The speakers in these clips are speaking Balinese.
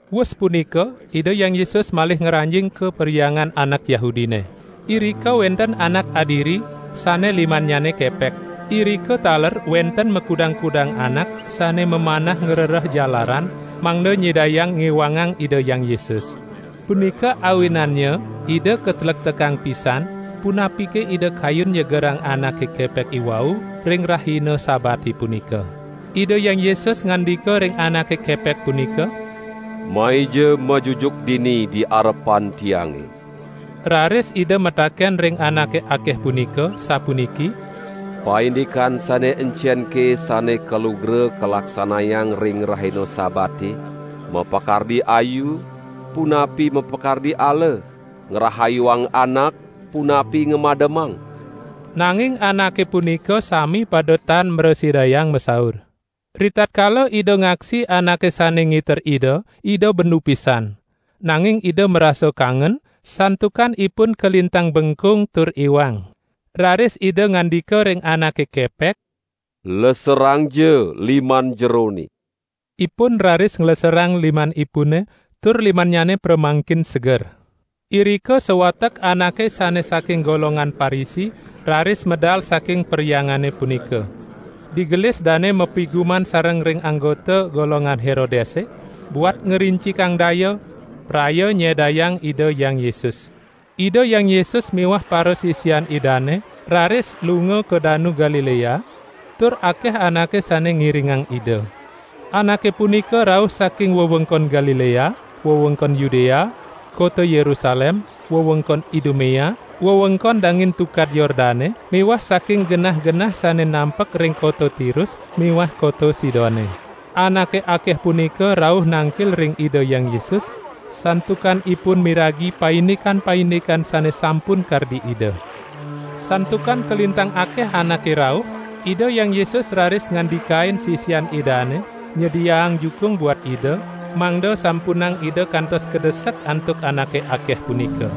Wus punika Ida Hyang Yesus malih ngranjing ka perhyangan anak Yahudine. Irika wenten anak adiri, sane limannyane kepek. Irika taler wenten makudang-kudang anak sane mamanah ngrereh jalaran mangda nyidayang ngiwangang Ida Hyang Yesus. Punika awinannya Ida katlektekang pisan punapike Ida kayun nyegerang anake kepek iwau ring rahina Sabate punika. Ida Hyang Yesus ngandika ring anake kepek punika: "Maija majujuk dini di arepan Tiange!" Raris Ida mataken ring anake akeh punika, sapuniki: "Paindikan sane encenke sane kalugra kalaksanayang ring rahina Sabate, mapakardi ayu, punapi mapakardi ala? Ngrahayuang anak punapi ngamademang?" Nanging anake punika sami pada tan mrasidayang masaur. Ritatkala Ida ngaksi anake sane ngiter Ida, Ida bendu pisan. Nanging Ida marasa kangen, santukan ipun kalintang bengkung tur iwang. Raris Ida ngandika ring anake kepek: "Leserangja liman jerone!" Ipun raris ngleserang limanipune tur limannyane pramangkin seger. Irika sawatek anake sane saking golongan Parisi raris medal saking perhyangane punika. Digelis dane mapiguman sareng ring anggota golongan Herodese, buat ngrincikang daya, praya nyedayang Ida Hyang Yesus. Ida Hyang Yesus miwah parasisian Idane raris lunga ka Danu Galilea, tur akeh anake sane ngiringang Ida. Anake punika rauh saking wewengkon Galilea, wewengkon Yudea, kota Yerusalem, wewengkon Idumea, wewengkon dangin Tukad Yordane miwah saking genah-genah sane nampek ring kota Tirus miwah kota Sidone. Anake akeh punika rauh nangkil ring Ida Hyang Yesus, santukan ipun miragi paindikan-paindikan sane sampun kardi Ida. Santukan kalintang akeh anake rauh, Ida Hyang Yesus raris ngandikain sisian Idane nyediaang jukung buat Ida, mangda sampunang Ida kantos kadesek antuk anake akeh punika.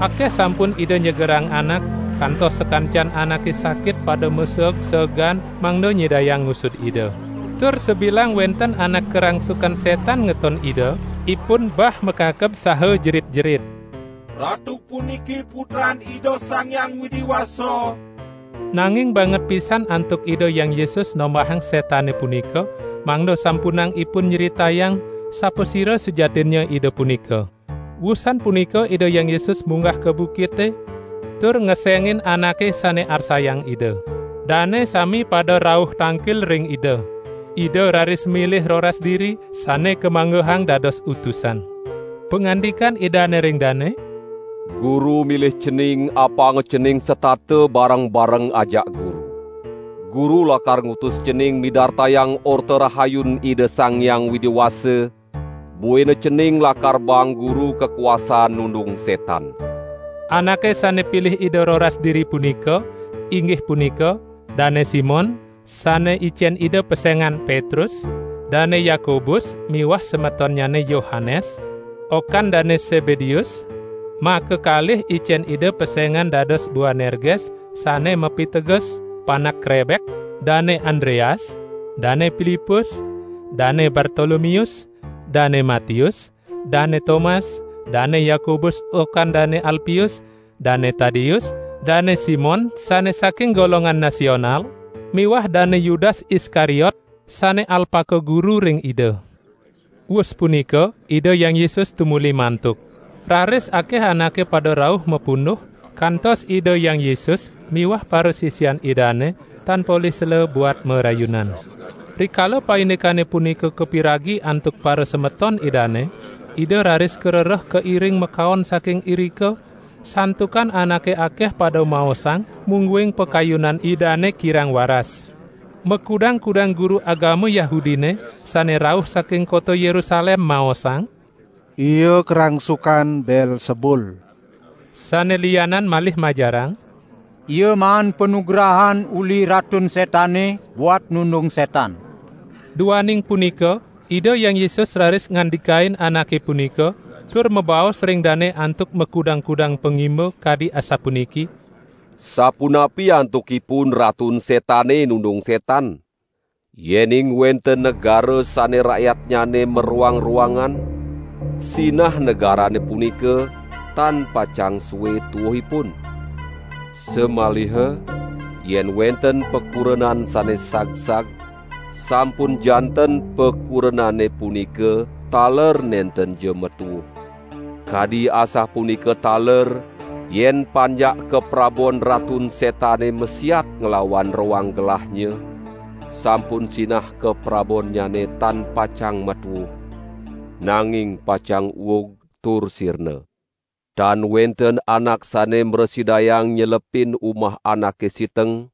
Akeh sampun Ida nyegerang anak, kantos sakancan anake sakit pada maseeg-seegan mangda nyidayang ngusud Ida. Tur sabilang wenten anak karangsukan setan ngeton Ida, ipun bah makakeb saha jerit-jerit: "Ratu puniki Putran Ida Sang Hyang Widi Wasa!" Nanging banget pisan antuk Ida Hyang Yesus nombahang setane punika, mangda sampunang ipun nyritayang, sapasira sujatinnya Ida punika. Wusan punika Ida Hyang Yesus munggah ka bukite, tur ngesengin anake sane arsayang Ida. Dane sami pada rauh tangkil ring Ida. Ida raris milih roras diri, sane kamanggehang dados utusan. Pangandikan Idane ring dane: "Guru milih cening apanga cening setata bareng-bareng ajak Guru. Guru lakar ngutus cening midartayang Orta Rahayun Ida Sang Hyang Widi Wasa, buina cening lakar baang Guru kakuasaan nundung setan." Anake sane pilih Ida roras diri punika, inggih punika: Dane Simon (sane icen Ida pesengan: Petrus), Dane Yakobus miwah semetonnyane Yohanes, okan Dane Sebedeus (makakalih icen Ida pesengan dados Boanerges, sane mapiteges: panak krebek), Dane Andreas, Dane Pilipus, Dane Bartolomeus, Dane Matius, Dane Tomas, Dane Yakobus okan Dane Alpius, Dane Tadeus, Dane Simon sane saking golongan Nasional, miwah Dane Yudas Iskariot sane alpaka guru ring Ida. Wus punika Ida Hyang Yesus tumuli mantuk. Raris akeh anake pada rauh mapunduh, kantos Ida Hyang Yesus miwah parasisian Idane tan polih sela buat marayunan. Rikala paindikane punika kapiragi antuk parasemeton Idane, Ida raris karereh kairing makaon saking irika, santukan anake akeh pada maosang mungguing pakayunan Idane kirang waras. Makudang-kudang guru agama Yahudine sane rauh saking kota Yerusalem maosang: "Ia karangsukan Beelsebul." Sane lianan malih majarang: "Ia maan panugrahan uli Ratun Setane buat nundung setan." Duaning punika Ida Hyang Yesus raris ngandikain anake punika, tur mabaos ring dane antuk makudang-kudang pangimba kadi asapuniki: "Sapunapi antukipun Ratun Setane nundung Ratun Setan? Yening wenten negara sane rakyatnyane maroang-roangan, sinah negarane punika tan pacang sue tuuhipun. Samaliha yen wenten pakurenan sane sagsag, sampun janten pakurenane punika taler nentenja matuuh. Kadi asapunika taler yen panjak kaprabon Ratun Setane masiat nglawan roang gelahnya, sampun sinah kaprabonnyane tan pacang matuuh, nanging pacang uug tur sirna. Tan wenten anak sane mrasidayang nyelepin umah anake siteng,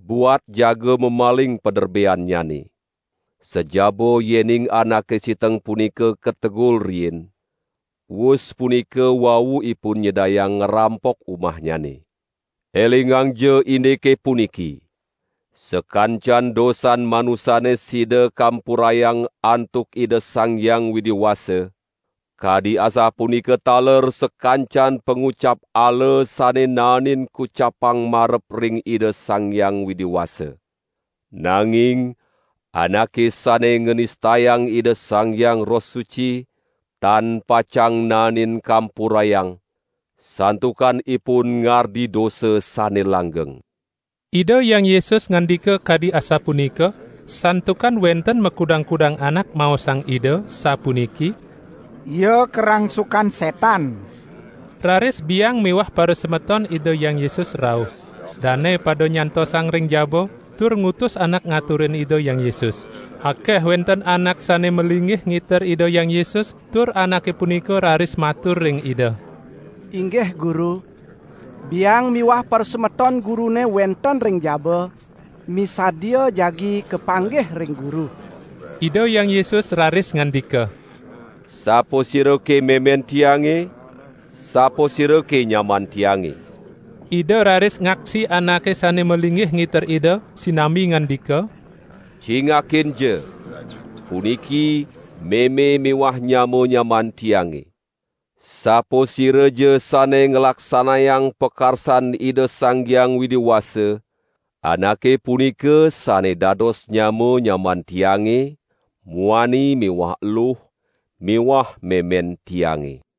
buat jaga mamaling paderbeannyane. Sajaba yening anake siteng punika kategul riin, wus punika wau ipun nyidayang ngrampok umahnyane. Elingangja indike puniki! Sakancan dosan manusane sida kampurayang antuk Ida Sang Hyang Widi Wasa, kadi asapunika taler sakancan pangucap ala sane naenin kucapang marep ring Ida Sang Hyang Widi Wasa. Nanging anake sane nganistayang Ida Sang Hyang Roh Suci, tan pacang naenin kampurayang santukan ipun ngardi dosa sane langgeng." ( Ida Hyang Yesus ngandika kadi asapunika, santukan wenten makudang-kudang anak maosang Ida, sapuniki: "Ia karangsukan setan.") Raris biang miwah parasemeton Ida Hyang Yesus rauh. Dane pada nyantosang ring jaba, tur ngutus anak ngaturin Ida Hyang Yesus. Akeh wenten anak sane malinggih ngiter Ida Hyang Yesus, tur anake punika raris matur ring Ida: "Inggih Guru, biang miwah parasemeton Gurune wenten ring jaba, misadia jagi kapanggih ring Guru." Ida Hyang Yesus raris ngandika: "Sapasirake memen Tiange? Sapasirake nyaman Tiange?" Ida raris ngaksi anake sane malinggih ngiter Ida, sinambi ngandika: "Cingakinja! Puniki meme miwah nyama-nyamaan Tiange. Sapasiraja sane nglaksanayang pakarsan Ida Sang Hyang Widi Wasa, anake punika sane dados nyama-nyamaan Tiange muani miwah eluh miwah memen Tiange."